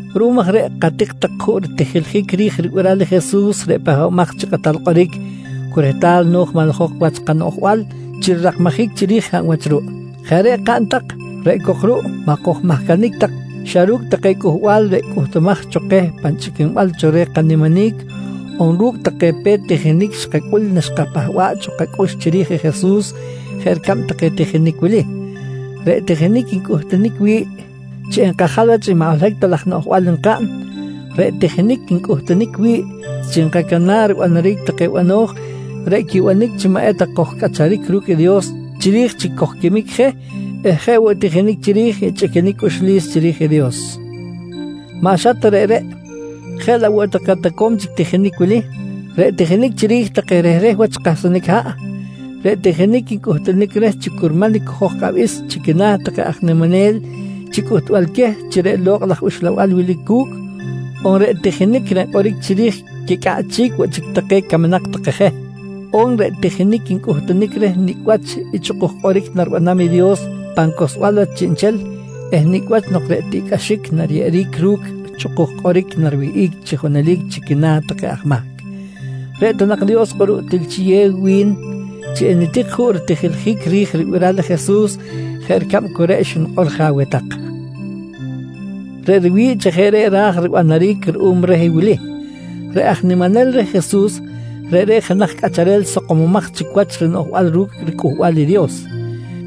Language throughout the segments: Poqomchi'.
Ruꞌum aj reꞌ katik tak juꞌ ritijiljic ri̱j ribiral i Jesus reꞌ Pahbamaj chi Kꞌatal Kꞌoric cu rehtal no̱j manlajok wach i kanoꞌjbal chi rirakmajic chiri̱j hab wach ruꞌ. Jeꞌ reꞌ kaꞌn tak reꞌ cok ruꞌ maꞌ kojcahnic tak xa ru̱cꞌ take cꞌuhbal reꞌ cꞌuhtumaj cho keh pan chꞌiquinbal cho reh kaniminic on ru̱cꞌ take pe̱t tijinic xkacꞌul naxkapahba̱ꞌ cho kacꞌux chiri̱j i Jesus jeꞌ ricab take tijinic wili: Reꞌ tijinic ncꞌuhtunic wi̱ꞌ chi nkajal wach i maꞌ holohic ta laj noꞌjbal nkaꞌn, reꞌ tijinic ncꞌuhtunic wi̱ꞌ chi nkacana̱ꞌ ribanaric take bano̱j reꞌ quibanic chi maꞌ eta kojcꞌacharic ru̱cꞌ i Dios chiri̱j chi kojquimic je eh je woꞌ i tijinic chiri̱j i chꞌiquinic cꞌuxlis chiri̱j i Dios. Maꞌ xa ta reꞌreꞌ, jeꞌ laꞌ woꞌ take toco̱m chic tijinic wili: Reꞌ tijinic chiri̱j take rehreh wach kahsanic haꞌ, reꞌ tijinic ncꞌuhtunic reh chi curman i cojo̱j kꞌabis chi quina̱ take aj niminel chi cꞌuhtbal queh chi reꞌ Lokꞌ laj Uxlabal wilic cu̱cꞌ, on reꞌ tijinic reꞌ nkꞌoric chiri̱j quicꞌaꞌchic woꞌ chic take camnak take je, on reꞌ tijinic ncꞌuhtunic reh nicꞌ wach i chꞌukuj kꞌoric naribanam i Dios pan cohlsbal wach chiꞌnchel eh nicꞌ wach nok reꞌ tiꞌcꞌaxic nariyeꞌeric ru̱cꞌ i chꞌukuj kꞌoric nariwihꞌic chi junelic chi quina̱ take aj mahc. Reꞌ ta nak Dios kꞌuruꞌ til chiyew wi̱n chi enitik juꞌ ritijiljic ri̱j ribiral i Jesus jeꞌ ricab cu reꞌ xnikꞌor je aweh tak. Reꞌ riwi̱ꞌ chi jeꞌ reꞌ raj ribanaric ruꞌum reh i wili: Reꞌ aj niminel reh Jesus, reꞌreꞌ jenaj cꞌacharel sakomomaj chic wach i rinoꞌjbal ru̱cꞌ riCꞌuhbal i Dios.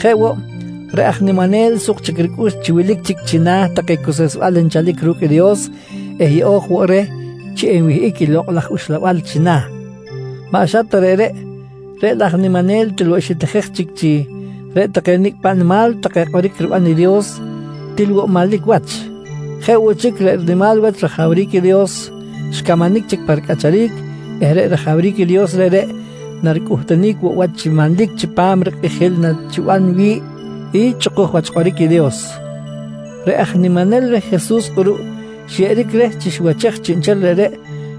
Jeꞌ woꞌ, reꞌ aj niminel suk chic ricꞌux chi wilic chic china̱ take cuseꞌsbal nchalic ru̱cꞌ i Dios eh yeꞌo̱j woꞌ reh chi enwihꞌic i Lokꞌ laj Uxlabal china̱. Maꞌ xa ta reꞌreꞌ, reꞌ laꞌ aj niminel til woꞌ xitijej chic chi reꞌ take nicꞌ paꞌ nimal take kꞌoric riban i Dios, til woꞌ manlic wach. Jeꞌ woꞌ chic, reꞌ rinimal wach rajawric i Dios xcamanic chic pa ricꞌacharic eh reꞌ rajawric i Dios reꞌreꞌ, naricꞌuhtunic woꞌ wach chi manlic chipam i rikꞌijil nachiban wi̱ꞌ i chꞌukuj wach kꞌoric i Dios. Reꞌ aj niminel reh Jesus kꞌuruꞌ xyeꞌeric reh chi xiwachej chiꞌnchel reꞌreꞌ,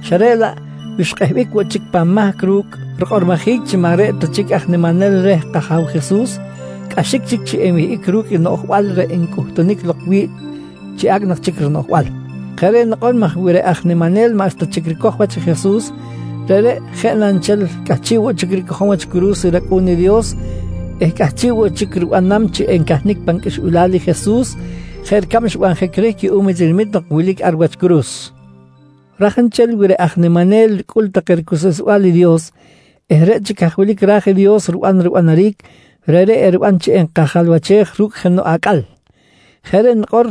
xa reꞌ laꞌ wi xkꞌehbic woꞌ chic pan mahc ru̱cꞌ rikꞌormojic chi maꞌ reꞌ ta chic aj niminel reh kAja̱w Jesus, cꞌaxic chic chi enwihꞌic ru̱cꞌ i noꞌjbal reꞌ ncꞌuhtunic lok wi̱ꞌ chi acꞌ nak chic rinoꞌjbal. Jeꞌ reꞌ nikꞌor maj wi reꞌ aj niminel maꞌxta chic ricoj wach i Jesus, reꞌreꞌ jeꞌ na nchel cꞌahchiꞌ woꞌ chic ricojom wach curu̱s i rAcꞌu̱n i Dios eh cꞌahchiꞌ woꞌ chic ribanam chi encahnic pan qꞌuixbilal i Jesus jeꞌ ricab xbanjic reh cuꞌum i tinamit nok wilic ar wach curu̱s. Raj nchel wi reꞌ aj niminel ricꞌul take ricuseꞌsbal i Dios eh reꞌ chic haj wilic ra̱j i Dios riban ribanaric, reꞌreꞌ eriban chi enkajalwachej ru̱cꞌ jenoꞌ acꞌal. Jeꞌ reꞌ nikꞌor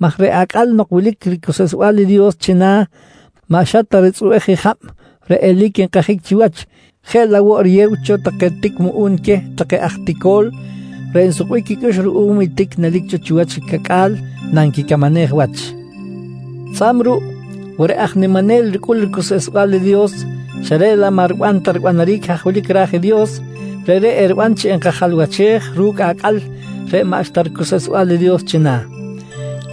maj reꞌ acꞌal nok wilic ricuseꞌsbal i Dios china̱ maꞌ xa ta ritzꞌubej i jab reꞌ eli̱c nkajic chiwach jeꞌ laꞌ woꞌ riyew cho take tic muꞌu̱n queh take aj tico̱l reꞌ nsukbic quicꞌux ruꞌum i tic nelic cho chiwach i cacꞌa̱l nanquicamanej wach. Tzꞌa̱b ruꞌ wi reꞌ aj niminel ricꞌul ricuseꞌsbal i Dios xa reꞌ laꞌ maꞌ riban ta ribanaric haj wilic ra̱j i Dios, reꞌreꞌ eriban chi enkajalwachej ru̱cꞌ i acꞌal reꞌ maꞌxta ricuseꞌsbal i Dios china̱.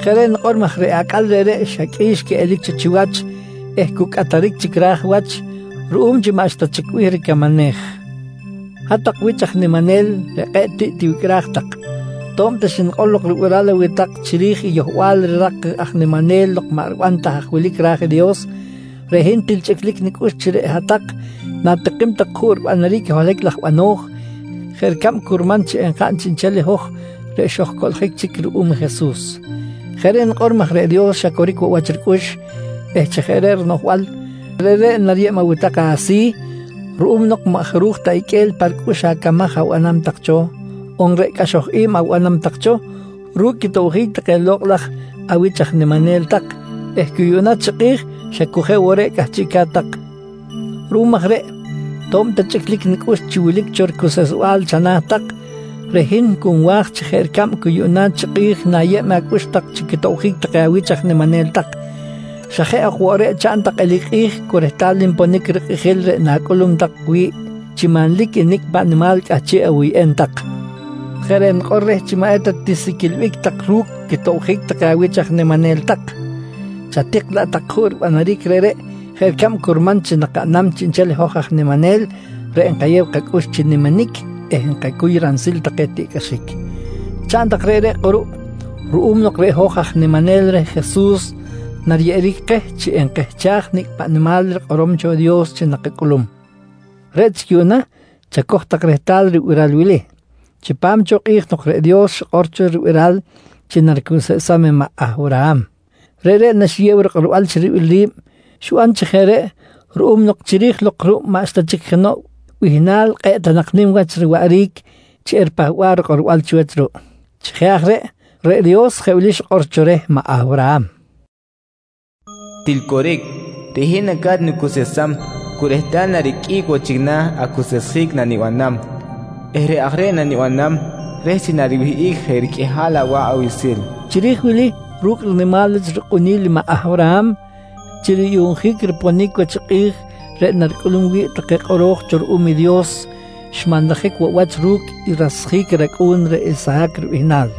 Jeꞌ reꞌ nikꞌor maj reꞌ acꞌal reꞌreꞌ xa qꞌui̱x quiꞌelic cho chiwach eh cu cꞌataric chic ra̱j wach ruꞌum chi maꞌxta chic bih ricamanej. Hat-tak wich aj niminel reꞌ kꞌe̱ꞌ tiꞌ tiwicꞌraj tak, to̱b ta xnikꞌor lok ribiral aweh tak chiri̱j i yohbal rirak i aj niminel nok maꞌ riban ta haj wilic i ra̱j i Dios, reꞌ hin til chꞌiclic nicꞌux chi reꞌ hat-tak na̱tikim tak juꞌ ribanaric i holohic laj bano̱j jeꞌ ricab curman chi enkaꞌn chiꞌnchel i hoj reꞌ xojcoꞌljic chic ruꞌum i Jesus. Jeꞌ reꞌ nikꞌor maj reꞌ Dios xa coric woꞌ wach ricꞌux eh chi jeꞌ reꞌ rinoꞌjbal, reꞌreꞌ nariyeb aweh tak asi̱ ruꞌum nok maꞌ jaruj ta iqꞌue̱l pa ricꞌux acamaj abanam tak cho on reꞌ cꞌaxoj i̱b abanam tak cho ru̱cꞌ quitobjic take lokꞌ laj awich aj niminel tak eh cu yuꞌna chi kꞌi̱j xa cu jeꞌ woꞌ reꞌ cꞌahchiꞌca̱t tak. Ruꞌum aj reꞌ to̱b ta chꞌiclic nicꞌux chi wilic cho ricuseꞌsbal chana̱ tak, reꞌ hin cu nwa̱j chi jeꞌ ricab cu yuꞌna chi kꞌi̱j nayew tak acꞌux chi quitobjic take awich aj niminel tak, xa jeꞌ ok woꞌ reꞌ chaꞌn tak eli̱c kꞌi̱j cu rehtal nponic rikꞌijil reꞌ na̱cꞌulum tak wi̱ꞌ chi manlic i nicꞌ paꞌ nimal cꞌahchiꞌ awuyꞌem tak. Jeꞌ reꞌ nikꞌor reh chi maꞌ eta tisiquilbic tak ru̱cꞌ quitobjic take awich aj niminel tak, chatik laꞌ tak juꞌ ribanaric reꞌreꞌ jeꞌ ricab curman chi nakaꞌnam chiꞌnchel i hoj aj niminel reꞌ nkayew kacꞌux chi niminic eh nkacuy ransil take tiꞌcꞌaxic. Chaꞌn tak reꞌreꞌ kꞌuruꞌ ruꞌum nok reꞌ hoj aj niminel reh Jesus nariyeꞌeric keh chi enkehchaj i nicꞌ paꞌ nimal rikꞌorom cho i Dios chi nakacꞌulum. Reꞌ chic yuꞌna chacoj tak rehtal i ribiral wili: Chipam cho kꞌi̱j nok reꞌ Dios xikꞌor cho ribiral chi naricuseꞌsam i maꞌ Awraham, reꞌreꞌ naxiyew rikꞌorbal chi ribil ri̱b, xiban chi jeꞌ reꞌ ruꞌum nok chiri̱j lok ruꞌ maꞌxta chic jenoꞌ bihnal kꞌe̱ꞌ ta nak nim wach riwaꞌric chi eripahba̱ꞌ rikꞌorbal chiwach ruꞌ. Chi jeꞌ aj reꞌ, reꞌ Dios jeꞌ wili xikꞌor cho reh maꞌ Awraham: “Til coric, reꞌ hin naca̱t nicuseꞌsam cu rehtal nariqꞌuic woꞌ chic na̱ acuseꞌsjic nanibanam eh reꞌ aj reꞌ nanibanam reh chi nariwihꞌic je riqꞌuihal awa̱ꞌ awiꞌsil, nqui Dios reh. Chiri̱j wili ru̱cꞌ rinimal wach rikꞌuni̱l i maꞌ Awraham chi ruyuꞌnjic i riponic wach i kꞌi̱j reꞌ naricꞌulum wi̱ꞌ take kꞌoro̱j cho reh ruꞌum i Dios, xmanlajic woꞌ wach ru̱cꞌ i rasjic i racꞌu̱n reꞌ Isahac ribihnal.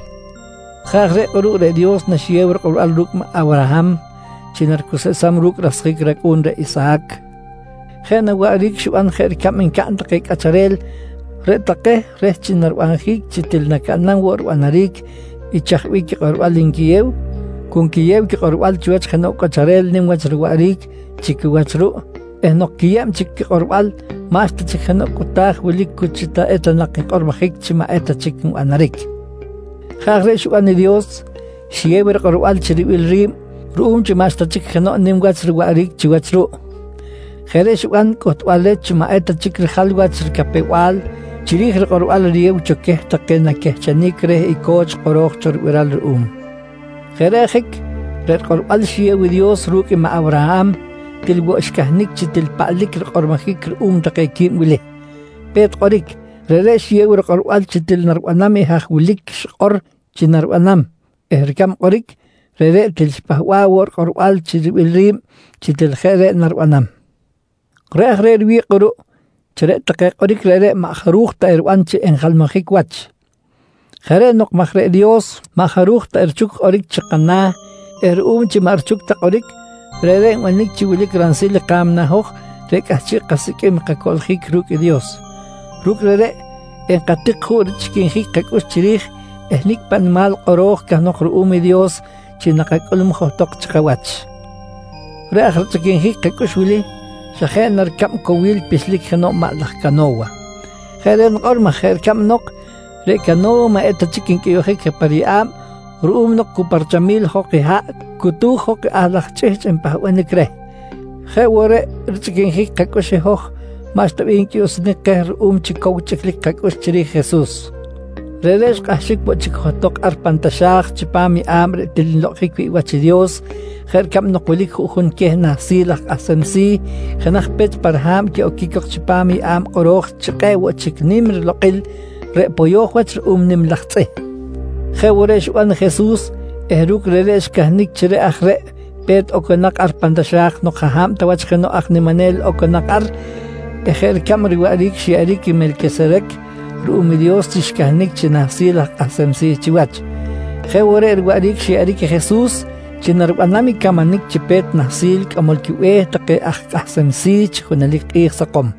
Jeꞌ aj reꞌ kꞌuruꞌ reꞌ Dios naxiyew rikꞌorbal ru̱cꞌ i Awraham chi naricuseꞌsam ru̱cꞌ rasjic i racꞌu̱n reꞌ Isahac, jeꞌ na waꞌric xiban jeꞌ ricab ncaꞌn take cꞌacharel reꞌ take reh chi narinabjic chi til nacaꞌnam woꞌ ribanaric i chaj bih quikꞌorbal nquiyew, cu nquiyew quikꞌorbal chiwach jenoꞌ cꞌacharel nim wach riwaꞌric chi quiwach ruꞌ eh nok quiyeb chic quikꞌorbal maꞌxta chic jenoꞌ cꞌuta̱j wilic cu chi eta nak nkꞌormojic chi maꞌ eta chic nbanaric. Jeꞌ aj reꞌ xiban i Dios, xiyew rikꞌorbal chi ribil ri̱b ruꞌum chi maꞌxta chic jenoꞌ nim wach riwaꞌric chiwach ruꞌ. Jeꞌ reꞌ xiban cꞌuhtbal reh chi maꞌ eta chic rijal wach ricapew-bal chiri̱j rikꞌorbal riyeb cho queh take naquehchenic reh co̱ch kꞌoro̱j cho ribiral ruꞌum. Jeꞌ reꞌ ajic reꞌ rikꞌorbal xiyew i Dios ru̱cꞌ i maꞌ Awraham til woꞌ xcahnic chi til paꞌlic rikꞌormojic ruꞌum take quib wili: Pe̱t kꞌoric, reꞌreꞌ xiyew rikꞌorbal chi til naribanam i haj wilic xikꞌor chi naribanam eh ricab kꞌoric, reꞌreꞌ til xipahba̱ꞌ woꞌ rikꞌorbal chi ribil ri̱b chi til jeꞌ reꞌ naribanam. Reꞌ aj reꞌ riwi̱ꞌ kꞌuruꞌ chi reꞌ take kꞌoric reꞌreꞌ maꞌ jaruj ta eriban chi equijalmajic wach. Jeꞌ reꞌ nikꞌor maj reꞌ Dios maꞌ jaruj ta erichuc kꞌoric chikana̱ eh ruꞌum chi maꞌ richuc ta kꞌoric, reꞌreꞌ nbanic chi wilic ransil ka̱mna i hoj reꞌ cꞌahchiꞌ kasiqꞌuim i kacoꞌljic ru̱cꞌ i Dios. Ru̱cꞌ reꞌreꞌ enkatik juꞌ richꞌiquinjic kacꞌux chiri̱j i nicꞌ paꞌ nimal kꞌoro̱j cahnok ruꞌum i Dios chi nakacꞌulum johtok chi kawach. Reꞌ aj richꞌiquinjic kacꞌux wili, xa jeꞌ na ricab cowil pixlic jenoꞌ maꞌ laj cano̱wa. Jeꞌ reꞌ nikꞌor maj jeꞌ ricab nok reꞌ cano̱wa maꞌ eta chic ncꞌuyuꞌjic je pa riyeꞌa̱b ruꞌum nok chi cu pa richamil jok i haꞌ cutu̱j jok i ahl laj chꞌihchꞌ npahbanic reh, jeꞌ woꞌ reꞌ i richꞌiquinjic kacꞌux i hoj maꞌxta bih encꞌuyuꞌsunic keh ruꞌum chi cow chꞌiclic chiri̱j i Jesus. Reꞌreꞌ xkꞌahxic woꞌ chic johtok ar pan taxa̱j chipam yeꞌa̱b reꞌ til nlokꞌonjic wi̱ꞌ wach i Dios jeꞌ ricab nok wilic juꞌjun queh Nahsil aj Kꞌahsem Si̱ jenaj pech pa riha̱b quiꞌoquic cok chipam i yeꞌa̱b kꞌoro̱j chi “Kꞌe̱ꞌ woꞌ chic Nim riLokꞌil” reꞌ poyo̱j wach ru̱cꞌ nim laj tzꞌih. Jeꞌ woꞌ reꞌ xiban i Jesus eh ru̱cꞌ reꞌreꞌ xcahnic chi reꞌ aj reꞌ i pe̱t oconak ar pan taxa̱j nok jaꞌ hab ta wach jenoꞌ aj niminel oconak ar eh jeꞌ ricab riwaꞌric xyeꞌeric i Melquiserec ruꞌum i Dios chi xcahnic chi Nahsil aj Kꞌahsem Si̱ chiwach, jeꞌ woꞌ reꞌ riwaꞌric xyeꞌeric i Jesus chi naribanam i camanic chi Pe̱t Nahsil Cꞌamol quiBe̱h take aj kꞌahsem si̱ chi junelic kꞌi̱j sakom.